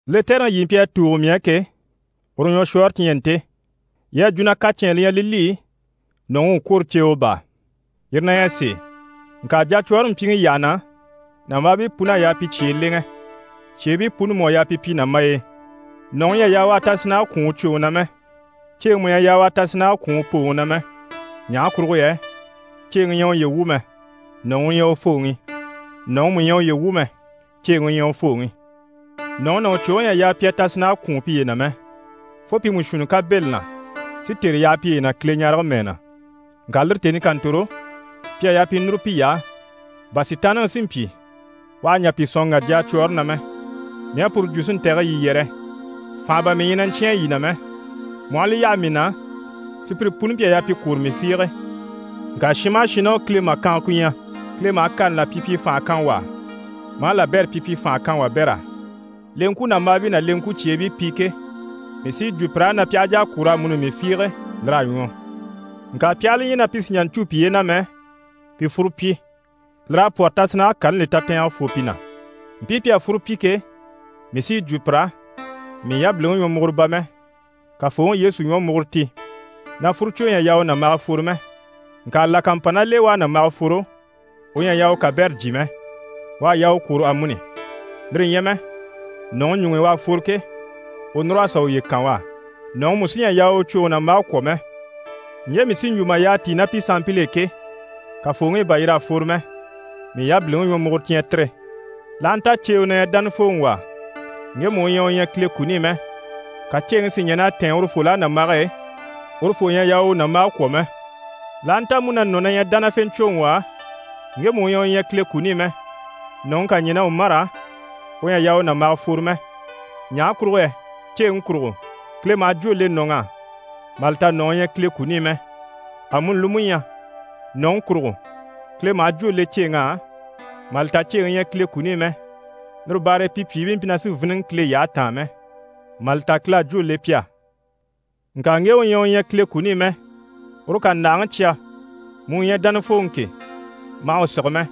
Lɛtɛrɛŋi yii mpyi a tùugo mii á ke, u ɲwɔshwɔɔre ti ɲyɛ nte. Yii à jwo na kacɛnni li ɲyɛ li li, nɔ̀ŋi u kwôro ceewe baa. Yire na ɲyɛ sèe, ŋka jacwɔɔre mpyiŋi yyaha na, nàmbaabii pun'à yaa pi cyee lèŋɛ, cyeebii puni mú à yaa pi pyi nàmbay'e. Nɔ̀ŋi ɲyɛ a yaa u tasinnage kwɔ̀n u cwoŋi na mɛ. Ceeŋi mú ɲyɛ a yaa u tasinnage kwɔ̀n u pooŋi na mɛ. Ɲaha kurugo yɛ ceeŋi ɲyɛ uye wu mɛ, nɔ̀ŋi u ɲyɛ u fooŋi. Nɔ̀ŋi mú ɲyɛ uye wu mɛ, ceeŋi u ɲyɛ u fooŋi. Nɔ̀ŋi ná u cwoŋi ɲyɛ a yaa pi a tasinnage kwùun piye na mɛ, fo pi mú shuunni ká bɛ̂ li na si tère yaha piye na Kileɲarege mɛɛ na. Ŋka lire tèni ká ntòro, pi à yaa pi núru piy'á, bà Sitaanniŋi si mpyi u àha ɲjà pi sɔ̀n ŋgà jacwɔɔre na mɛ. Mii à puru jwo si ntɛ̀gɛ yii yɛrɛ, fànha bà mii ɲyɛ na ɲcyáan yii na mɛ. Mu aha li yaha mii na, sùpyire puni mpyi a yaa pi kwôro mii fiige. Ŋka shin maha shin ná u Kile màkanga ku ɲyɛ, Kile maha kani là pyipyi fànha kan wà á, maa labɛrɛ pyipyi fànha kan wabɛr'á. Leŋkwunambaabii ná leŋkwucyeebii pi ke, mii sí yi jwo pir'á na pi aha jà a kwôro amuni mii fiige, lir'à ɲwɔ. Ŋka pi aha li ɲya na pi sì n‑jà cû piye na mɛ, pi fúru pyi, lir'à pwɔ́rɔ tasinnage kani li tatɛɛnge fô pi na. Mpii pi à fúru pyi ke, mii sí yi jwo pir'á, mii yabiliŋi ɲwɔmuguro bà mɛ, Kafooŋi Yesu ɲwɔmuguro ti, na fúrucwo ɲyɛ a yaa u nàmbaga fworo mɛ. Ŋka là ká mpa ná l'e u à nàmbaga fworo, u ɲyɛ a yaa u kabɛrɛ jyè mɛ, u à yaa u kwôro amuni, lire ɲyɛ mɛ nɔ̀ŋi ɲuŋ'i u à fworo ke, u núr'a sà uye kan u á. Nɔ̀ŋi mú sí ɲyɛ a yaa u u cwoŋi nàmbage kwɔ̀ mɛ. Ɲje mii sí n‑jwo mà yyaha tíi ná pi sanmpil'e ke, Kafooŋi i bà yir'à fworo mɛ, mii yabiliŋi ɲwɔmuguro ti ɲyɛ tire. L'aha nta ceewe na ɲyɛ dánafooŋi wà á, ŋgemu u ɲyɛ u ɲyɛ Kile kuni i mɛ, ka ceeŋi si ɲɛn'a tɛ̀ɛn urufol'á nàmbage e, urufoo ɲyɛ a yaa u u nàmbage kwɔ̀ mɛ. L'aha nta mú na nɔ̀ na ɲyɛ dánafeeɲcwoŋi wà á, ŋgemu u ɲyɛ u ɲyɛ Kile kuni i mɛ, nɔ̀ŋi ká ɲɛn'a u mâra, u ɲyɛ a yaa u nàmbaga fworo mɛ. Ɲaha kurugo yɛ ceeŋi kurugo, Kile maha jwó le nɔ̀ŋ'á mà li ta nɔ̀ŋi ɲyɛ Kile kuni i mɛ. Amuni li mú ɲyɛ, nɔ̀ŋi kurugo, Kile maha jwó le ceeŋ'á mà li ta ceeŋi ɲyɛ Kile kuni i mɛ. Lire baare e pi pyìibii mpyi na sì n‑fíniŋɛ Kile yyahe taan mɛ, mà li ta Kile à jwó le pi á. Ŋka ŋge u ɲyɛ u ɲyɛ Kile kuni i mɛ, uru ká ndàhaŋi cya, mu u ɲyɛ dánafooŋi ke, ma hà u sige mɛ.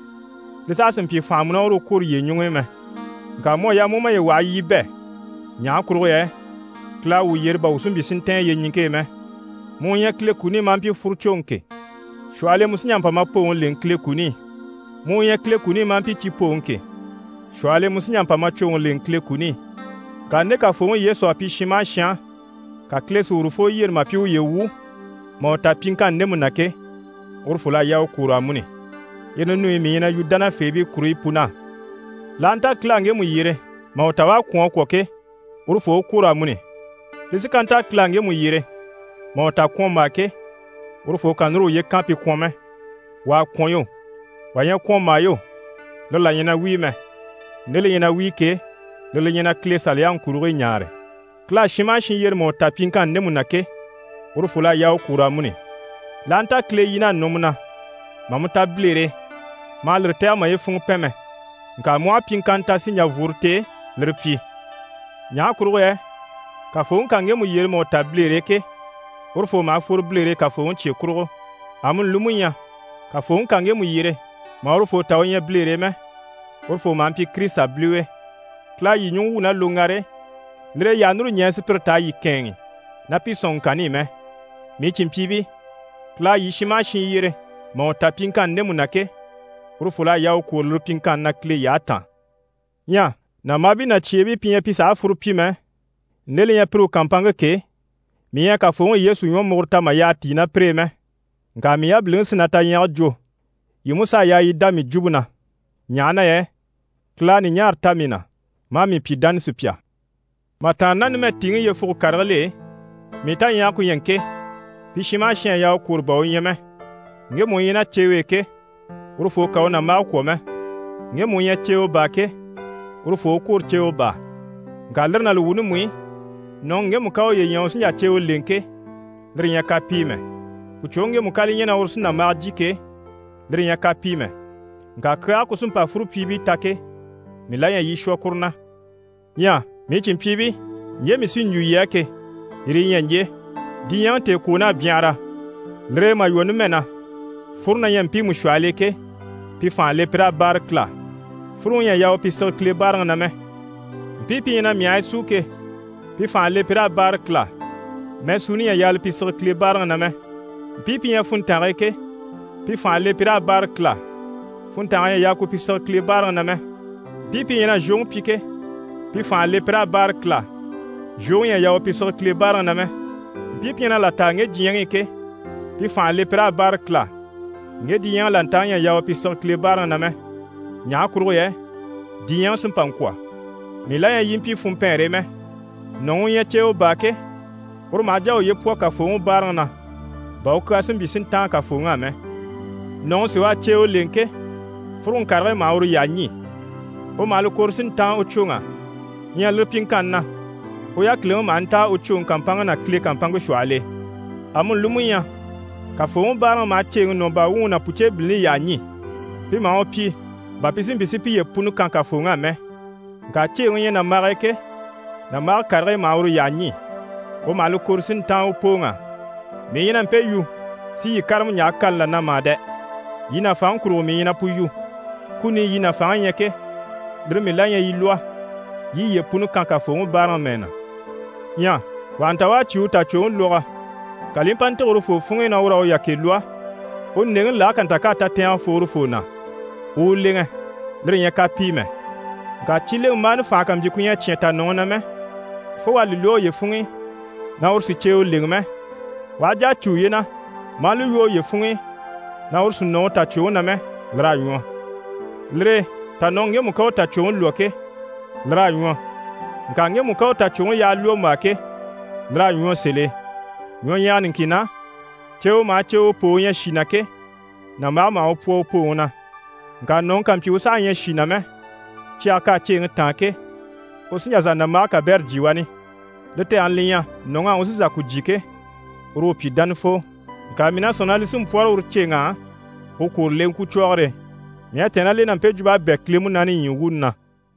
Li saha sì n‑pyi fànha mu ná uru u kwôro yiye ɲuŋ'i mɛ. Ŋka mu à yaa mu u maye waha yii i bɛ̂. Ɲaha kurugo yɛ Kile à wuu yyere bà wuu si mpyi si ntɛ̀ɛn yyeɲiŋke e mɛ. Mu u ɲyɛ Kile kuni i maa mpyi fúrucwoŋi ke, shwɔhɔl'e mu sí n‑jà n‑pa ma pooŋi lèŋɛ Kile kuni i. Mu u ɲyɛ Kile kuni i maa mpyi cipooŋi ke, shwɔhɔl'e mu sí n‑jà n‑pa ma cwoŋi lèŋɛ Kile kuni i. Ŋka nde Kafooŋi Yesu à pyi shin maha shin á, ka Kile si urufoo yyere mà pyi uye wu mà u ta pyiŋkanni ndemu na ke, urufol'à yaa u kwôro amuni. Yire ninuyi mii ɲyɛ na yu dánafeebii kuruɲyi pun'á. L'aha nta Kile à ŋgemu yyere mà u ta u à kwɔ̀n a kwɔ̀ ke, urufoo u kwôro amuni. Li sí ká nta Kile à ŋgemu yyere mà u ta kwɔ̀nmbaa ke, urufoo kà núru uye kan pi kwɔ̀n mɛ. Wà à kwɔ̀n yo, wà ɲyɛ kwɔ̀nmbaa yo, lire là ɲyɛ na wíi mɛ. Nde li ɲyɛ na wíi ke, lire li ɲyɛ na Kile Saliyaŋi kurigii ɲaare. Kile à shin maha shin yyere mà u ta pyiŋkanni ndemu na ke, urufol'à yaa u kwôro amuni. L'aha nta Kile yin'à nɔ mu na mà mu ta bilere e, ma hà lire tɛ̀gɛ maye funŋɔ pɛn mɛ. Ŋka mu aha pyiŋkanna ta si ɲjà vworo t'e, lire pyi. Ɲaha kurugo yɛ Kafooŋi ká ŋgemu yyere mà u ta bilere e ke, urufoo maha fworo bilere e Kafooŋi cye kurugo. Amuni li mú ɲyɛ, Kafooŋi ká ŋgemu yyere mà urufoo ta u ɲyɛ bilere e mɛ, urufoo maha mpyi Kirisita biliwe. Kile à yii ɲùŋɔ wwû ná loŋgare e, lire e yii àha núru ɲɛɛ sùpyire t'a yii kɛ̂ɛnŋi ná pi sɔ̀nŋɔŋkanni i mɛ. Mii cìnmpyiibii, Kile à yii shin maha shin yyere mà u ta pyiŋkanni ndemu na ke, urufol'à yaa u kwôro lire pyiŋkanni na Kile yyahe taan. Ɲyɛ nàmbaabii ná cyeebii pi ɲyɛ pi sàha fúru pyi mɛ, nde li ɲyɛ pire u kàmpanŋke ke, mii ɲyɛ a Kafooŋi Yesu ɲwɔmuguro ta mà yyaha tíi ná pire e mɛ. Ŋka mii yabiliŋi sí na taɲyage jwo, yii mú s'a yaa yii dá mii jwumpe na, ɲaha na yɛ Kile à ɲùɲaara ta mii na, maa mii pyi dánasupya. Mà tàanna ná numɛ tìiŋi yyefuge karigil'e, mii taɲyage ku ɲyɛ ŋke: pi shin maha shin à yaa u kwôro bà u ɲyɛ mɛ. Ŋgemu u ɲyɛ ná ceewe e ke, urufoo kà u nàmbage kwɔ̀ mɛ. Ŋgemu u ɲyɛ ceewe baa ke, urufoo u kwôro ceewe baa. Ŋka lire ná li wuuni mú i, nɔ̀ŋi ŋgemu ká uye ɲya u sí n‑jà ceewe lèŋɛ ke, lire ɲyɛ kapii mɛ. Pùcwoŋi ŋgemu ká li ɲya na uru sí nàmbaga jyè ke, lire ɲyɛ kapii mɛ. Ŋka kyaage ku sí n‑pa fúrupyiibii ta ke, mii la ɲyɛ yii i shwɔ kuru na. Ɲyɛ mii cìnmpyiibii, ɲje mii sí n‑jwo yii á ke, yire yi ɲyɛ ɲje, diɲyɛŋi tèekwoon'à byanhara, lire e mà lwɔ́ numɛ na, fúru na ɲyɛ mpiimu shwɔhɔl'e ke, pi fànha le pi raa báare Kile á, fúruŋi ɲyɛ a yaa u pi sige Kile báaraŋi na mɛ. Mpii pi ɲyɛ na myahigii súu ke, pi fànha le pi raa báare Kile á, mɛɛsuuni ɲyɛ a yaa li pi sige Kile báaraŋi na mɛ. Mpii pi ɲyɛ funntange e ke, pi fànha le pi raa báare Kile á, funntange ɲyɛ a yaa ku pi sige Kile báaraŋi na mɛ. Mpii pi ɲyɛ na zhwoŋi pyi ke, pi fànha le pi raa báare Kile á, zhwoŋi ɲyɛ a yaa u pi sige Kile báaraŋi na mɛ. Mpii pi ɲyɛ na là taa ŋge diɲyɛŋi i ke, pi fànha le pi raa báare Kile á, ŋge diɲyɛŋi làntaŋi ɲyɛ a yaa u pi sige Kile báaraŋi na mɛ. Ɲaha kurugo yɛ diɲyɛŋi sí n‑pa n‑kwɔ̀. Mii la ɲyɛ yii i mpyi funmpɛɛnre e mɛ. Nɔ̀ŋi u ɲyɛ ceewe baa ke, uru maha jà a uye pwɔ Kafooŋi báaraŋi na bà u kyaa si mpyi si ntáan Kafooŋi á mɛ. Nɔ̀ŋi sí u à ceewe lèŋɛ ke, fúruŋi karigii maha uru yyaha ɲî, u maha li kɔ̀re si ntáan u cwoŋ'á. Ɲyɛ lire pyiŋkanni na, u yákiliŋi maha ntáa u cwoŋi kàmpanŋke ná Kile kàmpanŋke shwɔhɔl'e. Amuni li mú ɲyɛ, Kafooŋi báaraŋi maha ceeŋi nɔ̀ baa wuŋi ná pùceebilini yyaha ɲî. Pi maha u pyi bà pi si mpyi si piye puni kan Kafooŋi á mɛ. Ŋka ceeŋi u ɲyɛ nàmbag'e ke, nàmbage karigii maha uru yyaha ɲî. U maha li kɔ̀re si ntáan u pooŋ'á. Mii ɲyɛ na mpe yu si yii kárama ɲjaha kani là na mà dɛ! Yii nàfanŋi kurugo mii ɲyɛ na pu yu. Kuni i yii nàfanŋi ɲyɛ ke, lire mii la ɲyɛ yii lwɔ́, yii i yiye puni kan Kafooŋi báaraŋi mɛɛ na. Ɲyɛ wà ha nta u à cyé u tàcwoŋi lwɔgɔ, ka li i mpa ntîge urufoo funŋ'i na ur'à u yakɛ lwɔ́, u ndèŋɛŋi lage ká nta k'à tatɛɛngɛ fô urufoo na, u u lèŋɛ, lire ɲyɛ kapii mɛ. Ŋka cileŋɛmbaani fànha ká mpyi ku ɲyɛ a cyán tànɔŋi na mɛ, fo u à li lwɔ́ uye funŋ'i na uru sì ceewe lèŋɛ mɛ, u aha jà a cû uye na, maa li lwɔ́ uye funŋ'i na uru sì nɔ u tàcwoŋi na mɛ, lir'à ɲwɔ. Lire e tànɔŋi ŋgemu ká u tàcwoŋi lwɔ́ ke, lir'à ɲwɔ, ŋka ŋgemu ká u tàcwoŋi yaha lwɔ́mbaa ke, lir'à ɲwɔ sèl'e. Ɲwɔɲyɛga niŋkin na, ceewe maha ceewe poo u ɲyɛ shì na ke, nàmbage maha u pwɔ u pooŋi na. Ŋka nɔ̀ŋi ká mpyi u saha ɲyɛ shì na mɛ, cyage k'à ceeŋi táan ke, u sí n‑jà n-sà nàmbage kabɛrɛ jyè wani, li tɛgɛni li ɲyɛ, nɔ̀ŋ'á u sí n‑shà ku jyè ke, uru u pyi dánafoo. Ŋka mii na sɔ̂nŋi na li sí n‑pwɔ́rɔ uru ceeŋ'á u kwôro leŋkwucwɔgɔre e. Mii à tɛ̀ɛn ná l'e na mpe jwump'à bɛ̂ Kile Munaani ɲyii wuuni na.